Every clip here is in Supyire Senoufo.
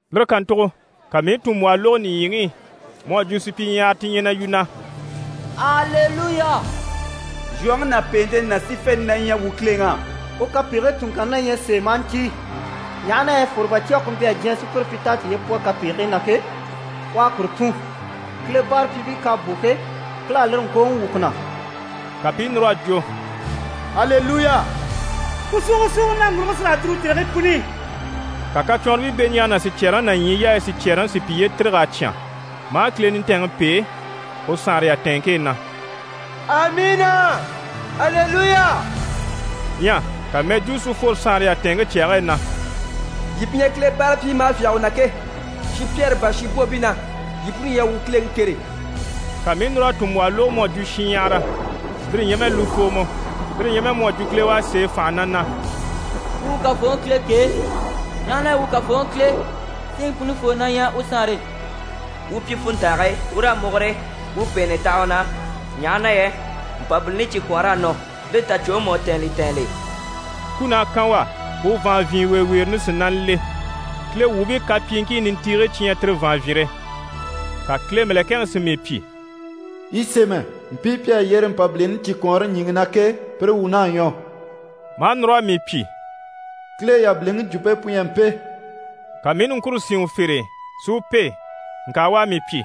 Lire kàntugo ka mii i tùnmbwɔhɔ lógo nìɲyiŋi i, mu à jwo supyiɲyahara ti ɲyɛ na yu, na: «Aleluya! Zhwoŋi ná pèente ná sífente na ɲyɛ wuu Kileŋi á. U kapegigii tunŋkanni na ɲyɛ sèe, maa ntíi, ɲaha na yɛ fwòrobacwɔge ku mpyi a diɲyɛ sùpyire pyi t'à tiye pwɔ kapegigii na ke, u à kuru tùn. Kile báarapyiibii k'à bò ke, Kile à lire ŋkooŋi wwû ku na.» Ka pi i núr'a jwo: «Aleluya! Ku súugosuugo naŋguruge sí raa dùru tèrigii puni i.» Ka kacwɔnribii beɲjaaga ná sicyɛɛreŋi ná ɲyii yaayi sicyɛɛreŋi si piye tîrig'a cyán, maa Kile nintɛɛnŋi pêe u saanre yatɛɛnŋke e na: «Amiina, Aleluya!» Ɲyɛ ka mɛjwuu si fworo saanre yatɛɛnŋke cyage e na: «Yii pi ɲyɛ Kile báarapyiibii maa fyáge u na ke, shinpyɛɛre bâra shinbwoobii na, yii puni, yii a wuu Kileŋi kêre.» Ka mii i núr'a tùnmbwɔhɔ lógo mu à jwo shinɲyahara, lire ɲyɛ mɛ lufoomɔ, lire ɲyɛ mɛ mu à jwo kile u à sêe fànha na na: «Wuu wuu Kafooŋi Kile kêe, ɲaha na yɛ wuu Kafooŋi Kile, Siŋi Punifoo na ɲyɛ u saanre e. Wuu pyi funntange e, wuu raa múgure, wuu u pèenɛ taha u na, ɲaha na yɛ Mpabilini cikwɔɔnr'à nɔ, li tàcwoŋi mú à tɛ̀ɛn li tɛɛnl'e. Kun'à kan u á, u vàanvyinweeweere nisinana le. Kile wuubii kapyiiŋkii nintiigii cyi ɲyɛ tire vàanvyinre.» Ka Kile mɛ̀lɛkɛŋi si mii pyi: «Yi sémɛ “mpii pi à yyére Mpabilini cikwɔɔnre ɲjyìŋi na ke, pire wuun'à ɲwɔ.”» Maa núr'a mii pyi: «Kile yabiliŋi jwumpe pu ɲyɛ mpe.» Ka mii i niŋkure sín u fere e si u pêe, ŋka u à mii pyi: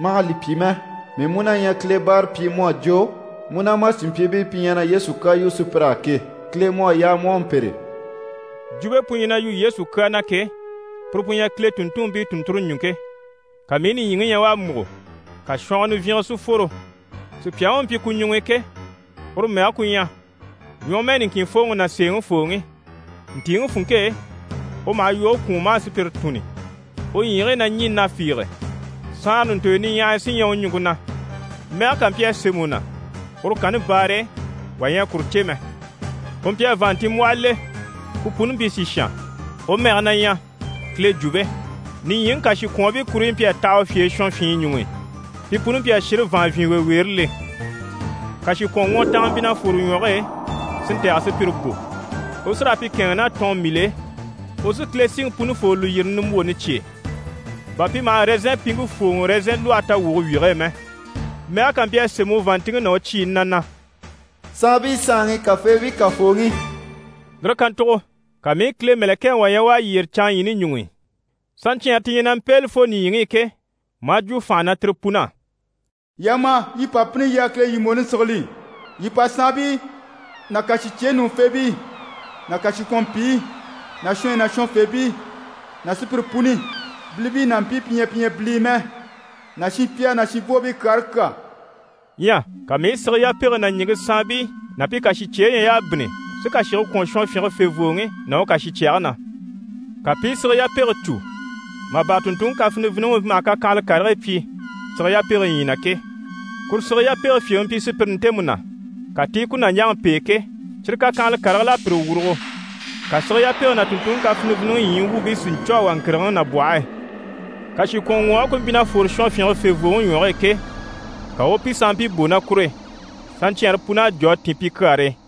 «Ma hà li pyi mɛ, mii mú na ɲyɛ Kile báarapyi mu à jwo mu ná ma cìnmpyiibii pi ɲyɛ na Yesu kyaa yu sùpyir'á ke. Kile mu à yaa mu u a mpêre.» Jwumpe pu ɲyɛ na yu Yesu kyaa na ke, puru pu ɲyɛ Kile tùnntunmpii tùnnture ɲùŋke. Ka mii i nìɲyiŋi ɲya u à múgo, ka shɔngɔ nivyinge si fworo. Sùpyaŋi u mpyi ku ɲuŋ'i ke, uru mɛge ku ɲyɛ: «Ɲwɔmɛɛ niŋkinfooŋi ná sèeŋifooŋi». Ntìiŋi funŋke e, u maha yoge kwùun maa sùpyire tùnni. U ɲyiigii na ɲî na fiige, saanra ɲùntoyo niɲyahaya sí ɲyɛ u ɲùŋke na. Mɛge kà mpyi a sémɛ u na, uru kanni baare e wà ɲyɛ a kuru cè mɛ. U mpyi a vàanntinmbwɔhɔ le, ku puni mpyi sìshan. U mɛge na ɲyɛ: «Kile Jwumpe». Nìɲyiŋi kàshikwɔɔnbii kuruɲyi mpyi a taha u fye e shɔnfyinyi ɲuŋ'i. Pi puni mpyi a shire vàanvyinweeweere le. Kàshikwɔnŋwɔtanga mpyi na fwore u ɲwɔge e, si ntɛ̀gɛ sùpyire bò. U sí raa pi kɛ̂ɛnŋi ná tɔɔnmbil'e. U sí Kile Siŋi Punifoo lùyirini nimbwooni cyêe, bà pi maha ɛrɛzɛnpiŋke fwòoŋɔ ɛrɛzɛn lwɔhe tawwuge wyige e mɛ. Mɛge kà mpyi a sémɛ u vàanntinŋke ná u cyiini na na: «saanbii Saanŋi, kàfeebii Kafooŋi». Lire kàntugo ka mii i Kile mɛ̀lɛkɛŋi wà ɲya u à yyére canŋaɲyiini ɲuŋ'i, saɲcyɛɛnre ti ɲyɛ na mpéeli fo nìɲyiŋi i ke, maa jwo fànha na tire pun'á: «Yii a ma, yii pa bínni yii a Kile lyìmbwooni sigili. Yii pa saanbii ná kàshicyeyi ɲùŋufeebii ná kàshikwɔnmpiyi ná shɔnyi ná shɔnfeempii ná sùpyire puni, bilibii ná mpii pi ɲyɛ pi ɲyɛ bilii mɛ, ná shinpyɛɛre ná shinbwoobii kyaare kyà.» Ɲyɛ ka mii i sige yapege ná ɲìŋke saanbii ná pi kàshicyeyi ɲya y'à bínni si kàshige kwɔ̀n shɔnfyinge fèvooŋi ná u kàshicyɛge na. Ka pi i sige yapege cû mà bâra tùnntunŋi kaviniviniŋi u mpyi maha kakyanhala karigii pyi sige yapege ɲyii na ke. Kuru sige yapege fyèŋi mpyi sùpyire ntemu na, ka ti i ku nàɲjaŋi pêe ke, cyire kakyanhala karigil'à pire wurugo. Ka sige yapege ná tùnntunŋi kafiniviniŋi ɲyii wuubii si ɲcû a wà ŋkìrigiŋi nabwɔhe e. Kàshikwɔnŋwɔɔge ku mpyi na fwore shɔnfyinge fèvooŋi ɲwɔge e ke, ka u u pi sanmpii bò ná kur'e. Saɲcyɛɛnre pun'à jò a tìn pi kyaare e.